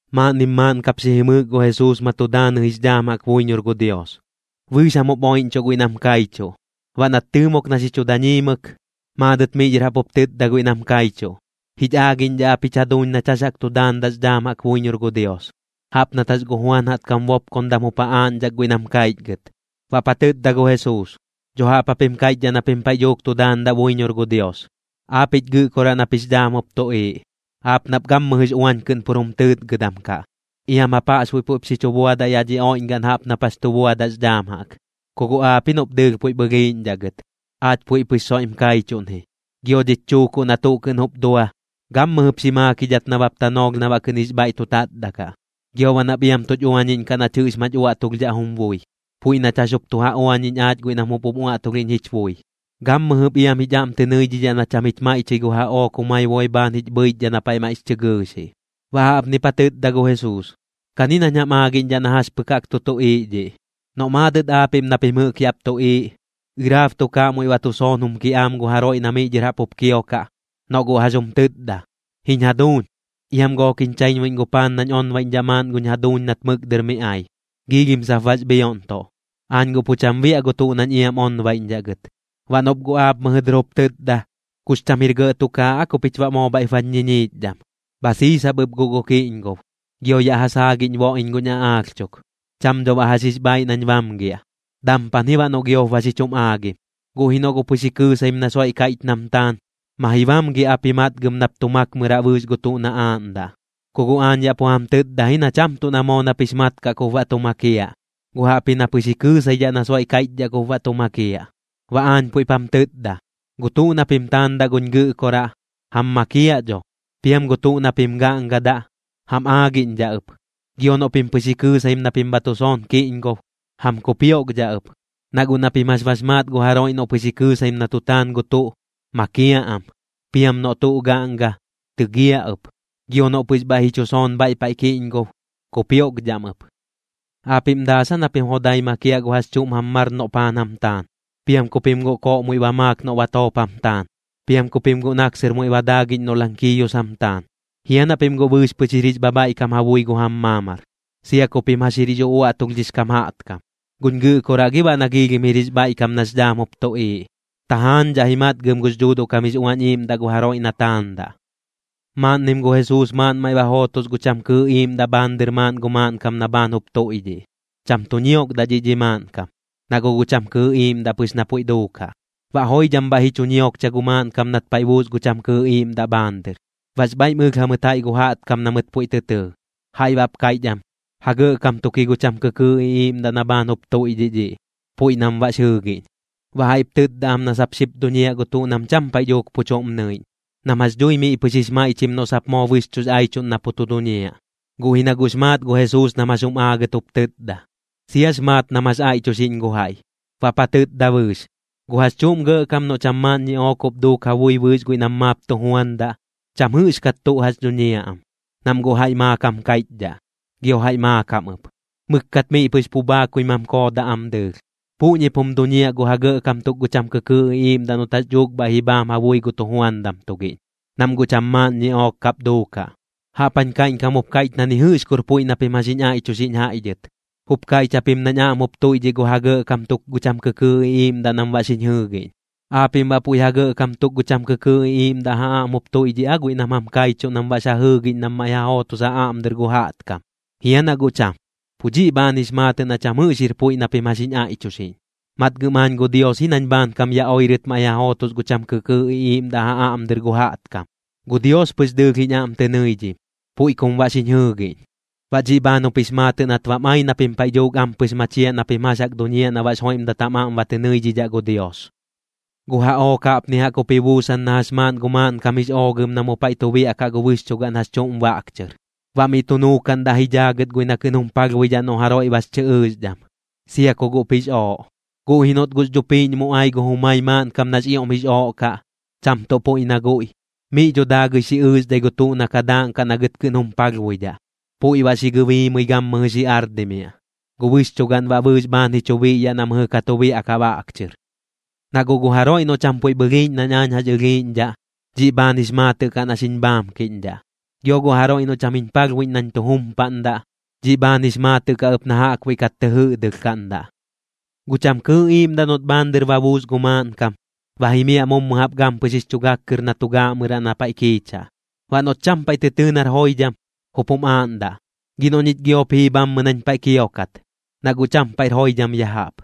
Maaꞌnnim maaꞌn kap xi jimɨɨk gu Jesuus ma tu daanɨ jix dhaam jaꞌk buiñor gu Dios, bɨɨx jam jup oiꞌñchuꞌ guiꞌ nam kaichuꞌ. Baꞌ nat tɨɨmok na xi chu dañiimɨk, maadɨt miꞌ dhɨr jaꞌp jup tɨtda guiꞌ nam kaichuꞌ: ―Jich aagiꞌñdhaꞌ ap jich jaduuñ nach jax jaꞌk tu daandaꞌx dhaam jaꞌk buiñor gu Dios, jaꞌp nat jax gu Juan jaꞌtkam bopkondam jup ja aaꞌñdhak guiꞌ nam kaichgɨt. Baꞌp ja tɨtda gu Jesuus: ―Dho jaꞌp japim kaiꞌchdhaꞌ na pim paiꞌ dhuuk tu daandaꞌ buiñor gu Dios: Aapiꞌch Gɨꞌkoraꞌ nap jix dhaam jup tuꞌiiꞌ, aap nap gammɨjɨx uañ kɨꞌn pur jum tɨɨtgɨdam kaꞌ. Iam jap jaꞌxbuiꞌ puiꞌp xi chu buadaꞌ yaꞌ dhi oiꞌñgaꞌn jaꞌp nap jax tu buadaꞌx dhaam jaꞌk. Ku guꞌ aap ji noꞌp dɨɨlh puiꞌp ɨlhiiꞌñdhaꞌ gɨt, aach puiꞌ pɨx soiꞌm kaichuꞌn ji. Gio dhich chuukuꞌ na tuꞌ kɨꞌn jup dua, gammɨjɨp xi maakidhat nabap tanoolh na baꞌ kɨꞌn jix bhaiꞌ tu tatda kaꞌ. Gio baꞌ nap iam tuch uañiꞌñkaꞌ nach jɨꞌx mach uaꞌtulhdhaꞌ jum bui, puiꞌ nach jax jup tu ja uañiꞌñ aach guiꞌ nam jup jum uaꞌtulhiꞌñ jich bui. Gammɨjɨp iam jich aꞌm tɨ nɨidhidhaꞌ na cham jich maiꞌchɨi gu jaꞌook jumai boi bhaan jich bhɨichdhaꞌ na paiꞌ maiꞌx chɨ gɨɨxiꞌ. Baꞌ jaꞌpnip ja tɨtda gu Jesuus: ―Kani nañ jam aagiꞌñdhaꞌ na jax pɨk jaꞌk tu tuꞌiiꞌ dhiꞌ. Noꞌ maadɨt aapiꞌm na pim jɨꞌk yaꞌp tuꞌiiꞌ, ɨraab tukaaꞌ muiꞌ ba tu soon jum kiꞌaam gu jaroiꞌ na miꞌ dhɨr jaꞌp jup kiokaꞌ, noꞌ guꞌ jax jum tɨtda: “Jiñ jaduuñ, iam gook jiñ chaiñbuiꞌñ gu paan nañ onbaiꞌñdhaꞌ maaꞌn guñ jaduuñ nat mɨk dɨr mi ai. Giilhim sap bax bhioꞌntuꞌ, aañ guꞌ pu cham biaꞌ gu tuꞌ nañ iam onbaiꞌñdhaꞌ gɨt.” Baꞌ noꞌp guꞌ aap mɨjɨ dɨr jup tɨtda: “Kux cham jir gɇꞌ tukaaꞌ aa ku pich baꞌ moo bhaiꞌp bañ ñiñiichdham. Bha siisap ɨp guꞌ gu kiꞌñgob, gio yaꞌ ja saagiꞌñ boꞌ iñ guñ aꞌaalh chuk. Cham dho baꞌ jax jix bhaaiꞌ nañ bamgiaꞌ, dampan ji baꞌ noꞌ giop ba xi chum aagim.” Guꞌ ji noꞌ guꞌ pɨx ji kɨɨsaim na soiꞌ kaiꞌch nam taan, ma ji bamgiaꞌp ji matgɨm nap tu makmɨraꞌ bɨɨx gu tuꞌ na aaꞌndaꞌ. Ku guꞌ aañ yaꞌ pu jam tɨtda ji na cham tuꞌ na moo nap jix mat kaꞌ kup baꞌ tu makiaꞌ, guꞌ jaꞌpji na pɨx ji kɨɨsaidhaꞌ na soiꞌ kaiꞌchdhaꞌ kup baꞌ tu makiaꞌ. Baꞌ aañ puiꞌp jam tɨtda, gu tuꞌ na pim taandaꞌ guñ Gɨꞌkoraꞌ, jam makiaꞌ dho. Piam gu tuꞌ na pim gaꞌngadaꞌ, jam aagiꞌñdhaꞌ ɨp. Gio noꞌ pim pɨx ji kɨɨsaim na pim bha tu soon kiꞌñgob, jam kupioꞌkdhaꞌ ɨp. Na guꞌ na pim jax bax maat gu jaroiꞌ noꞌ pɨx ji kɨɨsaim na tu taan gu tuꞌ, makiaꞌ am. Piam noꞌ tuꞌ gaꞌnga, tɨgiaꞌ ɨp. Gio noꞌ pɨx bhaiꞌ ji chu soon bhaiꞌ paiꞌ kiꞌñgob, kupioꞌkdhaꞌm ɨp. ’¿Aapiꞌm daas aa na pim jodai makiaꞌ gu jax chuꞌm jam mar noꞌ paan jam taan? ¿Piam ku pim guꞌ koꞌ muiꞌ ba maak noꞌ batoop jam taan? ¿Piam ku pim guꞌ naksɨr muiꞌ ba daagiꞌñ noꞌ lankiiyus jam taan? ¿Jia na pim guꞌ bɨɨx pɨx jir jix bhabhaiꞌkam ja bui gu jam maamar, sia ku pim jax jir jix uꞌuaꞌtulhdhix kam jaꞌtkam? ¿Guñ Gɨꞌkoraꞌ gi baꞌ na giilhim jir jix bhaiꞌkam nax dhaam jup tuꞌiiꞌ? Tajaañdhaꞌ ji matgɨm gux Dhuuduꞌ kam jix Uañ Iiꞌmdagaꞌn gu jaroiꞌ na taandaꞌ. Maaꞌnnim gu Jesuus maaꞌn maiꞌ ba jootos gu cham kɨɨꞌ iiꞌmdaꞌ bhaan dɨr maaꞌn gu maaꞌnkam na bhaan jup tuiꞌdhiꞌ. Cham tu ñiokdaꞌ dhiꞌ dhi maaꞌnkam, na guꞌ gu cham kɨɨꞌ iiꞌmdaꞌ pɨx na puiꞌ duukaꞌ. Baꞌ joidham bhaiꞌ ji chu ñiokcha gu maaꞌnkam nat paiꞌ ba buus gu cham kɨɨꞌ iiꞌmdaꞌ bhaan dɨr. Baꞌx bhaiꞌm ɨlh jamɨt jaiꞌ gu jaꞌtkam na mɨt puiꞌ tɨ tɨɨ. Jaiꞌ baꞌp kaiꞌch am: ―Ja gɇꞌkam tuk ji gu cham kɨkɨɨꞌ iꞌiiꞌmdaꞌ na bhaan jup tuiꞌdhiꞌ dhiꞌ, puiꞌ nam baꞌx jɨɨgiꞌñ. Baꞌ jaiꞌp tɨtda am na sap xip duñiaꞌ gu tuꞌ nam cham paiꞌ dhuuk pu chuꞌm nɨiꞌñ, nam jax dhui miꞌ pɨx jix maiꞌchim noꞌ sap moo bɨxchuꞌx aichuꞌn na pu tu duñiaꞌ. Guꞌ ji na guꞌx maat gu Jesuus nam jax jum aagɨt jup tɨtda, siax maat nam jax aiꞌchuxiꞌñ gu jaiꞌ. Baꞌp ja tɨtda bɨɨx: ―Gu jax chuꞌm gɇꞌkam noꞌ cham maaꞌn ñiꞌook jup duuk ja bui bɨɨx guiꞌ nam maap tu juandaꞌ, cham jɨꞌxkat tuꞌ jax dhuñiaꞌ am, nam guꞌ jaiꞌ maakam kaiꞌchdhaꞌ, gio jaiꞌ maakam ɨp. Mɨkkat miꞌ pɨx pu bhaakui mam koodaꞌ am dɨɨlh. Puꞌñip jum duñiaꞌ gu ja gɇꞌkam tuk gu cham kɨkɨɨꞌ iꞌiiꞌmdaꞌ noꞌt jax dhuuk bhaiꞌ ji bhaam ja bui gu tujuandam tugiꞌñ, nam guꞌ cham maaꞌn ñiꞌook kap duukaꞌ. Jaꞌp jañ kaiꞌñkam jup kaiꞌch na ni jɨꞌx kur puiꞌ na pim jax jiñ aiꞌchuxiꞌñ jaiꞌ dhɨt. Jup kaiꞌch japim nañ aꞌm jup tuiꞌdhiꞌ gu ja gɇꞌkam tuk gu cham kɨkɨɨꞌ iꞌiiꞌmdaꞌ nam baꞌ xiñ jɨɨgiꞌñ. ¿Aapiꞌm baꞌ puiꞌ ja gɇꞌkam tuk gu cham kɨkɨɨꞌ iꞌiiꞌmdaꞌ ja aꞌm jup tuiꞌdhiꞌ aa guiꞌ nam jam kaichuꞌ nam baꞌx ja jɨɨgiꞌñ nam maiꞌ ja jootos ja aꞌm dɨr gu jaꞌtkam? ¿Jia na guꞌ cham? Pu dhiꞌ bhaan jix maatɨꞌ na cham jɨꞌx jir puiꞌ na pim jax jiñ aiꞌchuxiꞌñ. Matgɨm aañ gu Dios ji nañ bhaankam ya oirɨt maiꞌ ja jootos gu cham kɨkɨɨꞌ iꞌiiꞌmdaꞌ ja aꞌm dɨr gu jaꞌtkam. Gu Dios pɨx dɨɨlh jiñ aꞌm tɨ nɨidhim, puiꞌ kum baꞌ xiñ jɨɨgiꞌñ. Baꞌ dhiꞌ bhaan jup jix maatɨꞌ nat bam ai na pim paiꞌ dhuuk ampɨx machiaꞌ na pim jax jaꞌk duñiaꞌ na baꞌx joiꞌmdat jam aꞌm ba tɨ nɨidhidhaꞌ gu Dios. ’Gu jaꞌook jaꞌpni jaꞌk jup ji buusan na jax maaꞌn gu maaꞌnkam jix oogɨm na mu paiꞌ tu biaꞌkaꞌ gu bɨxchugaꞌn jax chuꞌm baꞌk chɨr. Baꞌ miꞌ tu nuukaꞌndaꞌ ji dhaagɨt guiꞌ na kɨꞌn jum palhbuidhaꞌ noꞌ jaroiꞌ bax chɨ ɨɨxdham, sia ku guꞌp jix ooꞌ. Guꞌ ji noꞌt guꞌx dhupiiꞌñ mu ai gu jumai maaꞌnkam nax ioꞌm jix ooꞌ kaꞌ, cham tuꞌ puiꞌ na guiꞌ, miꞌ dho daagɨi xi ɨɨxdhai gu tuꞌ na ka daaꞌnkaꞌ na gɨt kɨꞌn jum palhbuidhaꞌ, puiꞌ baꞌ xi gɨbiimɨi gammɨjɨ xi ardimiaꞌ. Gu bɨxchugaꞌn baꞌ bɨɨx bhaan ji chu biꞌyaꞌ na mɨjɨ ka tu biaꞌkaꞌ baꞌk chɨr. ’Na guꞌ gu jaroiꞌ noꞌ cham puiꞌp ɨlhiiꞌñ nañ aañ jax ɨlhiiꞌñdhaꞌ, dhiꞌ bhaan jix maatɨꞌ kaꞌ na xiñ bhaamkiꞌñdhaꞌ. Gio gu jaroiꞌ noꞌ cham jiñ palhbuiꞌñ nañ tu jumpaꞌndaꞌ, dhiꞌ bhaan jix maatɨꞌ kaꞌ ɨp na jaꞌkbuiꞌ kat tɨ jɨꞌdɨlhkaꞌndaꞌ. ’Gu cham kɨɨꞌ iiꞌmdaꞌ noꞌt bhaan dɨr ba buus gu maaꞌnkam, ba jimiaꞌ mummɨ jaꞌp gampɨx jix chu gak kɨr na tu gaaꞌmɨraꞌ na paiꞌ kiichaꞌ. Baꞌ noꞌt cham paiꞌ tɨ tɨɨ nar joidham, jup jum aaꞌndaꞌ: “Gi noꞌ ñich giop jii bhammɨ nañ paiꞌ kiokat, na guꞌ cham paiꞌr joidham ya jaꞌp.”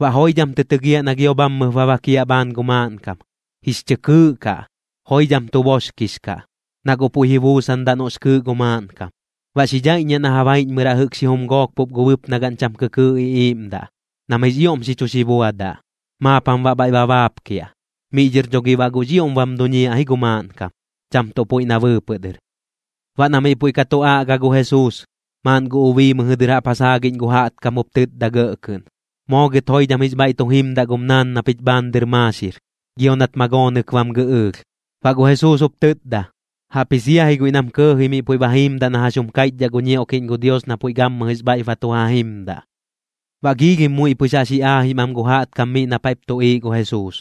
Baꞌ joidham tɨ tɨgiaꞌ na gio bhammɨp ba bakiaꞌ bhaan gu maaꞌnkam, jix chɨ kɨɨꞌ kaꞌ, joidham tu boxkix kaꞌ, na guꞌ puiꞌ ji buusandaꞌ noꞌx kɨɨꞌ gu maaꞌnkam. Baꞌ xi dhaiꞌññiaꞌ na ja baiꞌñmɨraꞌ jɨꞌk xijum gook pup gu bɨpnagaꞌn cham kɨkɨɨꞌ iꞌiiꞌmdaꞌ, nam jix ioꞌm xi chu xi buadaꞌ, maap jam baꞌ bhaiꞌ ba baapkiaꞌ. Miꞌ dhɨr dho gi baꞌ guꞌx ioꞌm bam duñiaꞌ ji gu maaꞌnkam, cham tuꞌ puiꞌ na bɨɨpɨꞌ dɨr. Baꞌ na miꞌ puiꞌ ka tu aꞌga gu Jesuus, maaꞌn gu ubii mɨjɨ dɨr jaꞌp ja saagiꞌñ gu jaꞌtkam jup tɨtda gɇꞌ kɨꞌn: ―Moo gɨt joidham jix bhaiꞌ tu jimdaꞌ gum naan na pich bhaan dɨr maaxir, gio nat magoonɨk bam gɨꞌɨɨlh. Baꞌ gu Jesuus jup tɨtda: ―Jaꞌpji sia ji guiꞌ nam kɇɇji miꞌ puiꞌ ba jiimdaꞌ na jax jum kaiꞌchdhaꞌ gu ñioꞌkiꞌñ gu Dios na puiꞌ gammɨjɨx bhaiꞌp ba tu ja jimdaꞌ. Baꞌ giilhim muiꞌ pɨx jaꞌx ji aajim am gu jaꞌtkam miꞌ na paiꞌp tuꞌiiꞌ gu Jesuus,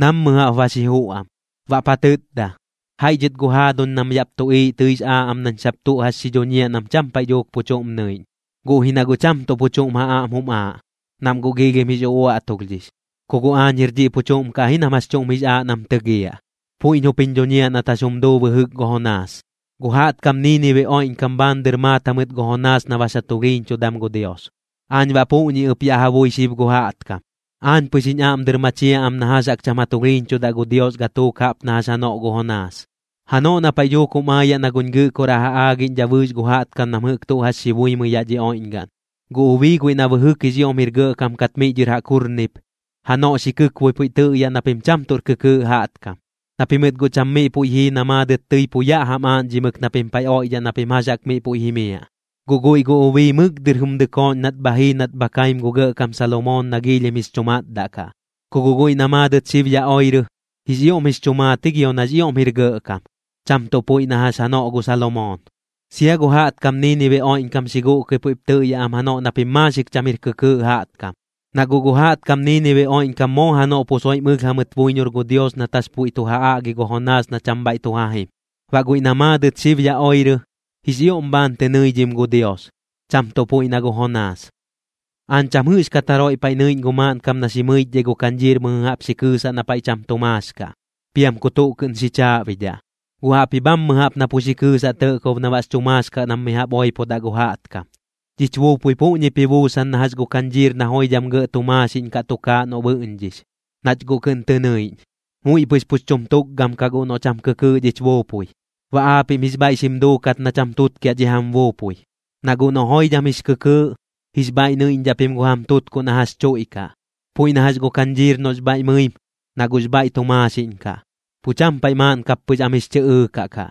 nammɨ jaꞌp ba xi juꞌ am. Baꞌp ja tɨtda: ―Jaiꞌ dhɨt gu jaaduñ nam yaꞌp tuꞌiiꞌ tɨix aaꞌ am nañ sap tuꞌ jax xi dhuñiaꞌ nam cham paiꞌ dhuuk pu chuꞌm nɨiꞌñ, guꞌ ji na guꞌ cham tuꞌ pu chuꞌm ja aꞌm jum aaꞌ, nam guꞌ giilhim jix uꞌuaꞌtulhdhix. Ku guꞌ aañ jir dhiꞌ pu chuꞌm kaꞌ ji nam jax chuꞌm jix aaꞌ nam tɨgiaꞌ, puiꞌñ jup jiñ dhuñiaꞌ nat jax jum duu bɨjɨk gu Jonaas. Gu jaꞌtkam Niinibe oiꞌñkam bhaan dɨr maat jamɨt gu Jonaas na bax ja tulhiiñchudam gu Dios. Aañ baꞌ puꞌñi ɨp yaꞌ ja bui xib gu jaꞌtkam, aañ pɨx jiñ aꞌm dɨr machiaꞌ am na jax jaꞌk cham ja tulhiiñchudaꞌ gu Dios gatuuk jaꞌp na jax janoꞌ gu Jonaas. Janoꞌ na paiꞌ dhuuk jum aayaꞌ na guñ Gɨꞌkoraꞌ ja aagiꞌñdhaꞌ bɨɨx gu jaꞌtkam nam jɨꞌk tuꞌ jax buimɨi yaꞌ dhi oiꞌñgaꞌn, gu ubii guiꞌ na bɨjɨk jix ioꞌm jir gɇꞌkam kat miꞌ dhɨr jaꞌk jurnip, janoꞌ xi kɨkboi puiꞌ tɨꞌyaꞌ na pim cham tuꞌr kɨkɨɨꞌ jaꞌtkam, na pimɨt guꞌ cham miꞌ puiꞌ jii na maadɨt tɨi pu yaꞌ jam aaꞌñdhimɨk na pim paiꞌ oiꞌdhaꞌ na pim jax jaꞌk miꞌ puiꞌ jimiaꞌ. Guꞌ guiꞌ gu ubii mɨk dɨr jum dɨkooꞌñ nat bha jii nat bha kaim gu gɇꞌkam Salomoon na giilhim jix chu matdaꞌ kaꞌ. Ku guꞌ guiꞌ na maadɨt xib ya oirɨ, jix ioꞌm jix chu maat ji gio nax ioꞌm jir gɇꞌkam, cham tuꞌ puiꞌ na jax janoꞌ gu Salomoon. Sia gu jaꞌtkam Niinibe oiꞌñkam xi guꞌkɨi puiꞌp tɨꞌyaꞌ am janoꞌ na pim maaxik cham jir kɨkɨɨꞌ jaꞌtkam. Na guꞌ gu jaꞌtkam Niinibe oiꞌñkam moo janoꞌ pu soiꞌm ɨlh jamɨt buiñor gu Dios nat jax puiꞌ tu ja aꞌgi gu Jonaas na cham bhaiꞌ tu ja jim. Baꞌ guiꞌ na maadɨt xib ya oirɨ, jix ioꞌm bhaan tɨ nɨidhim gu Dios, cham tuꞌ puiꞌ na gu Jonaas. ’Aañ cham jɨꞌxkat jaroiꞌ paiꞌ nɨiꞌñ gu maaꞌnkam na xi mɨichdhai gu kañdhiir mɨjɨ jaꞌp xi kɨɨsaꞌ na paiꞌ cham tu maax kaꞌ, piam ku tuꞌ kɨꞌn xi chaaꞌbidhaꞌ. Guꞌ jaꞌpji bhammɨ jaꞌp na pu xi kɨɨsaꞌ tɇꞌkob na baꞌx chu maax kaꞌ nam mi jaꞌp oipodaꞌ gu jaꞌtkam. Dhich buupui puꞌñip ji buusan na jax gu kañdhiir na joidham gɇꞌ tu maaxiꞌñ kaꞌ tukaaꞌ noꞌ bɨꞌñdhix, nach guꞌ kɨꞌn tɨ nɨiꞌñ. Muiꞌ pɨx pux chum tukgam kaꞌ guꞌ noꞌ cham kɨkɨɨꞌ dhich buupui. Baꞌ aapiꞌm jix bhaiꞌ xim duukat na cham tutkiaꞌ dhi jam buupui. Na guꞌ noꞌ joidham jix kɨkɨɨꞌ, jix bhaiꞌ nɨiꞌñdhaꞌ pim gu jam tutkuꞌ na jax chuiꞌkaꞌ. Puiꞌ na jax gu kañdhiir noꞌx bhaiꞌ mɨim, na guꞌx bhaiꞌ tu maaxiꞌñ kaꞌ, pu cham paiꞌ maaꞌn kap pɨx am jix chɨ ɨɨkaꞌ kaꞌ.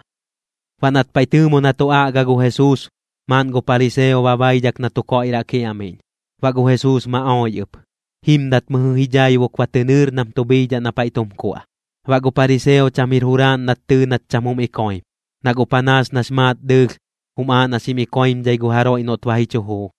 Baꞌ nat paiꞌ tɨɨmo na tu aꞌga gu Jesuus, maaꞌn gu pariseo ba baidhak na tu koiꞌraꞌ kiaꞌmiꞌñ. Baꞌ gu Jesuus ma oi ɨp, jimdat miꞌ ji dhaibuk ba tɨ nɨɨr nam tu bhiidhaꞌ na paiꞌ tum kuaꞌ. Baꞌ gu pariseo cham jir juraaꞌn nat tɨɨ nat cham jum ikoim, na guꞌ panaas nax maat dɨɨlh, jum aaꞌ na xim ikoimdhai gu jaroiꞌ noꞌt ba ji chu juu.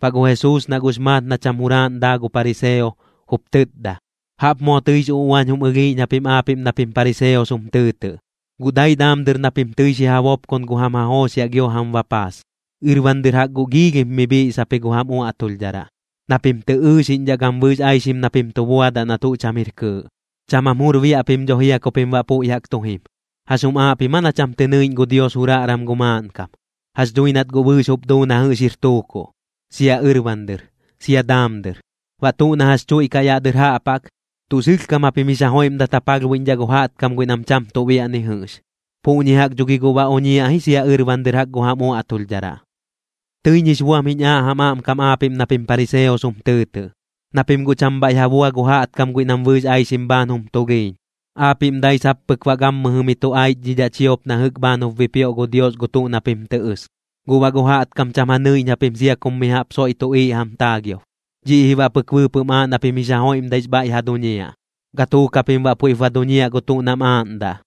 Baꞌ gu Jesuus na guꞌx maat na cham juraaꞌn daa gu pariseo, jup tɨtda: ―Jaꞌp moo tɨix uꞌuañ jum ɨlhiiꞌñ japim aapiꞌm na pim pariseos jum tɨɨtɨꞌ. Guꞌ dai daam dɨr na pim tɨi xi ja bopkon gu jam ja jooxiaꞌ gio jam bapaas, ɨrban dɨr jaꞌk guꞌ giilhim mi bhiꞌsap ji gu jam uaꞌtulhdharaꞌ, na pim tɨ ɨɨxiꞌñdhaꞌ gam bɨɨx aixim na pim tu buadaꞌ na tuꞌ cham jir kɨɨꞌ. Cham jam jur biaꞌ pim dho jia ku pim baꞌ puiꞌ jaꞌk tu jim. ¿Jax jum aaꞌ pim aa na cham tɨ nɨiꞌñ gu Dios juraꞌram gu maaꞌnkam? Jax dhui nat guꞌ bɨɨx jup duu na jɨꞌx jir tuukuꞌ, sia ɨrban dɨr, sia daam dɨr. Baꞌ tuꞌ na jax chuiꞌkaꞌ yaꞌ dɨr jaꞌp jaꞌk, tuꞌ sɨlhkam japim jix ja joiꞌmdat ja palhbuiꞌñdhaꞌ gu jaꞌtkam guiꞌ nam cham tuꞌ biaꞌ ni jɨꞌx. Puꞌñi jaꞌk dho gi guꞌ ba oñiaꞌ ji sia ɨrban dɨr jaꞌk gu jam uaꞌtulhdharaꞌ. ’Tɨiñ jix buam jiñ aaꞌ jam aꞌmkam aapiꞌm na pim pariseos jum tɨɨtɨꞌ, na pim guꞌ cham bhaiꞌ ja bua gu jaꞌtkam guiꞌ nam bɨɨx aixim bhaan jum tulhiiñ. Aapiꞌm dai sap pɨk baꞌ gammɨjɨ mi tu aichdhidhaꞌ chiop na jɨꞌk bhaan jup bipioꞌ gu Dios gu tuꞌ na pim tɨ ɨs, guꞌ baꞌ gu jaꞌtkam cham ja nɨnɨiꞌñ japim sia kum mi jaꞌp soiꞌ tuꞌiiꞌ jam taagiob. Dhiꞌ ji baꞌ pɨk bɨɨpɨꞌm aaꞌ na pim jix ja joiꞌmdaix bhaiꞌ ja duñiaꞌ, gatuuk japim baꞌ puiꞌp ba duñiaꞌ gu tuꞌ nam aaꞌndaꞌ.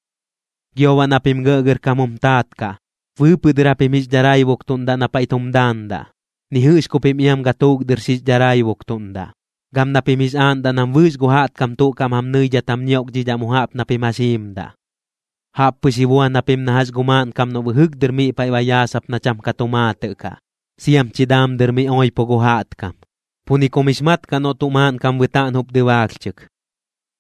’Gio baꞌ na pim gɇꞌgɇrkam jum taat kaꞌ, bɨɨpɨꞌ dɨr japim jix dharaibuktuꞌndaꞌ na paiꞌ tum daandaꞌ, ni jɨꞌx ku pim iam gatuuk dɨr xix dharaibuktuꞌndaꞌ. Gam na pim jix aaꞌndaꞌ nam bɨɨx gu jaꞌtkam tuꞌ kaꞌm jam nɨidhat jam ñioꞌkdhidhaꞌ mu jaꞌp na pim jax jiimdaꞌ. ’Jaꞌp pɨx ji buan japim na jax gu maaꞌnkam noꞌ bɨjɨk dɨr miꞌ paiꞌ ba yaasap na cham ka tu maatɨꞌ kaꞌ, siam chi daam dɨr mi oipo gu jaꞌtkam. Pu ni kum jix mat kaꞌ noꞌ tuꞌ maaꞌnkam bɨtaꞌn jup dɨbaalhchɨk.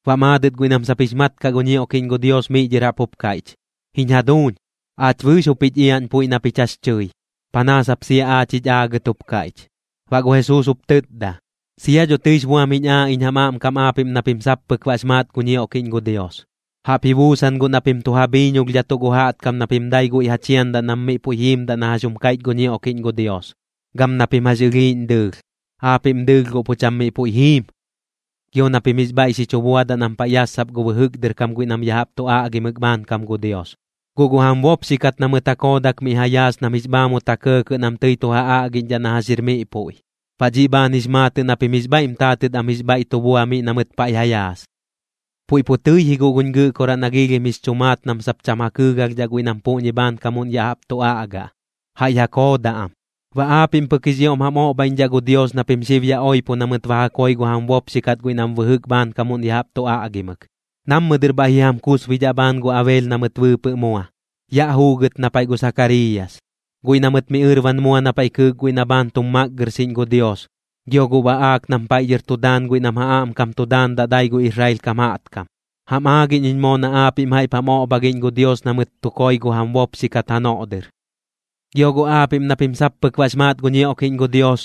Baꞌ maadɨt guiꞌ nam sap jix mat kaꞌ gu ñioꞌkiꞌñ gu Dios miꞌ dhɨr jaꞌp jup kaiꞌch: ―Jiñ jaduuñ, aach bɨɨx jup jich iaꞌñ puiꞌ na pich jax tɨi, panaas jap sia aach jich aagɨt jup kaiꞌch. Baꞌ gu Jesuus jup tɨtda: ―Sia dho tɨix buam jiñ aaꞌ iñ jam aꞌmkam aapiꞌm na pim sap pɨk baꞌx maat gu ñioꞌkiꞌñ gu Dios. Jaꞌp ji buusan guꞌ na pim tu ja bhiiñolhdhatuꞌ gu jaꞌtkam na pim dai guiꞌ ja chiandaꞌ nam miꞌ puiꞌ jiimdaꞌ na jax jum kaiꞌch gu ñioꞌkiꞌñ gu Dios, gam na pim jax ɨlhiiꞌñ dɨɨlh. Aapiꞌm dɨɨlh guꞌ pu cham miꞌ puiꞌ jiim. ’Gio na pim jix bhaiꞌ xi chu buadaꞌ nam paiꞌ yassap gu bɨjɨk dɨr kam guiꞌ nam ya jaꞌp tu aꞌgimɨk bhaankam gu Dios, guꞌ gu jam bopxi kat na mɨt ja koodak miꞌ ja yaas nam jix bhaamut ja kɇɇkɇꞌ nam tɨi tu ja aꞌgiꞌñdhaꞌ na jax jir miꞌ puiꞌ. Baꞌ dhiꞌ bhaan jix maatɨꞌ na pim jix bhaiꞌm taatɨt am jix bhaiꞌ tu bua miꞌ na mɨt paiꞌ ja yaas. ’Puiꞌ pu tɨi ji guꞌ guñ Gɨꞌkoraꞌ na giilhim jix chu maat nam sap cham ja kɨɨgalhdhaꞌ guiꞌ nam puꞌñi bhaankamuꞌn ya jaꞌp tu aꞌga, jaiꞌ ja koodaꞌ am. Baꞌ aapiꞌm pɨk jix ioꞌm jam oꞌbhaiꞌñdhaꞌ gu Dios na pim xib ya oipo na mɨt ba ja koi gu jam bopxi kat guiꞌ nam bɨjɨk bhaankamuꞌn ya jaꞌp tu aꞌgimɨk. Nammɨ dɨr bhaiꞌ ji jam kusbidhaꞌ bhaan gu Abel na mɨt bɨɨpɨꞌ mua, yaꞌ juugɨt na paiꞌ gu Sakariiyas, guiꞌ na mɨt mi ɨrban mua na paiꞌ kɨɨk guiꞌ na bhaan tum makgɨrxiꞌñ gu Dios, gio gu baꞌaak nam paiꞌ dhɨr tu daan guiꞌ nam ja aꞌmkam tu daandaꞌ dai gu Israel kam jaꞌtkam. Jam aagiꞌñ iñ moo na aapiꞌm jaiꞌp jam oꞌbhagiꞌñ gu Dios na mɨt tu koi gu jam bopxi kat janoꞌ dɨr. ’Gio guꞌ aapiꞌm na pim sap pɨk baꞌx maat gu ñioꞌkiꞌñ gu Dios,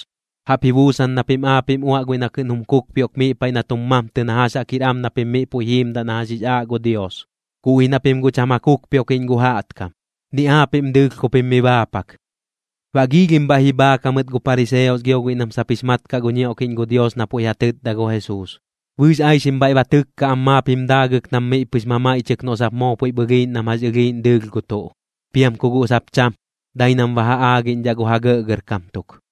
jaꞌp ji buusan na pim aapiꞌm uaꞌ guiꞌ na kɨꞌn jum kukpioꞌk miꞌ paiꞌ na tum mamtɨ na jax jaꞌk jir am na pim miꞌ puiꞌ jiimdaꞌ na jax jix aaꞌ gu Dios, guꞌ ji na pim guꞌ cham ja kukpioꞌkiꞌñ gu jaꞌtkam, ni aapiꞌm dɨɨlh ku pim mi baapak. Baꞌ giilhim bhaiꞌ ji bhaak jamɨt gu pariseos gio guiꞌ nam sap jix mat kaꞌ gu ñioꞌkiꞌñ gu Dios na puiꞌ ja tɨtda gu Jesuus. Bɨɨx aixim bhaiꞌ ba tɨkka am maap jim daagɨk nam miꞌ pɨx mamaiꞌchɨk noꞌ sap moo puiꞌp ɨlhiiꞌñ nam jax ɨlhiiꞌñ dɨɨlh gu tuꞌ, piam ku guꞌ sap cham, dai nam ba ja aagiꞌñdhaꞌ gu ja gɇꞌgɇrkam tuk.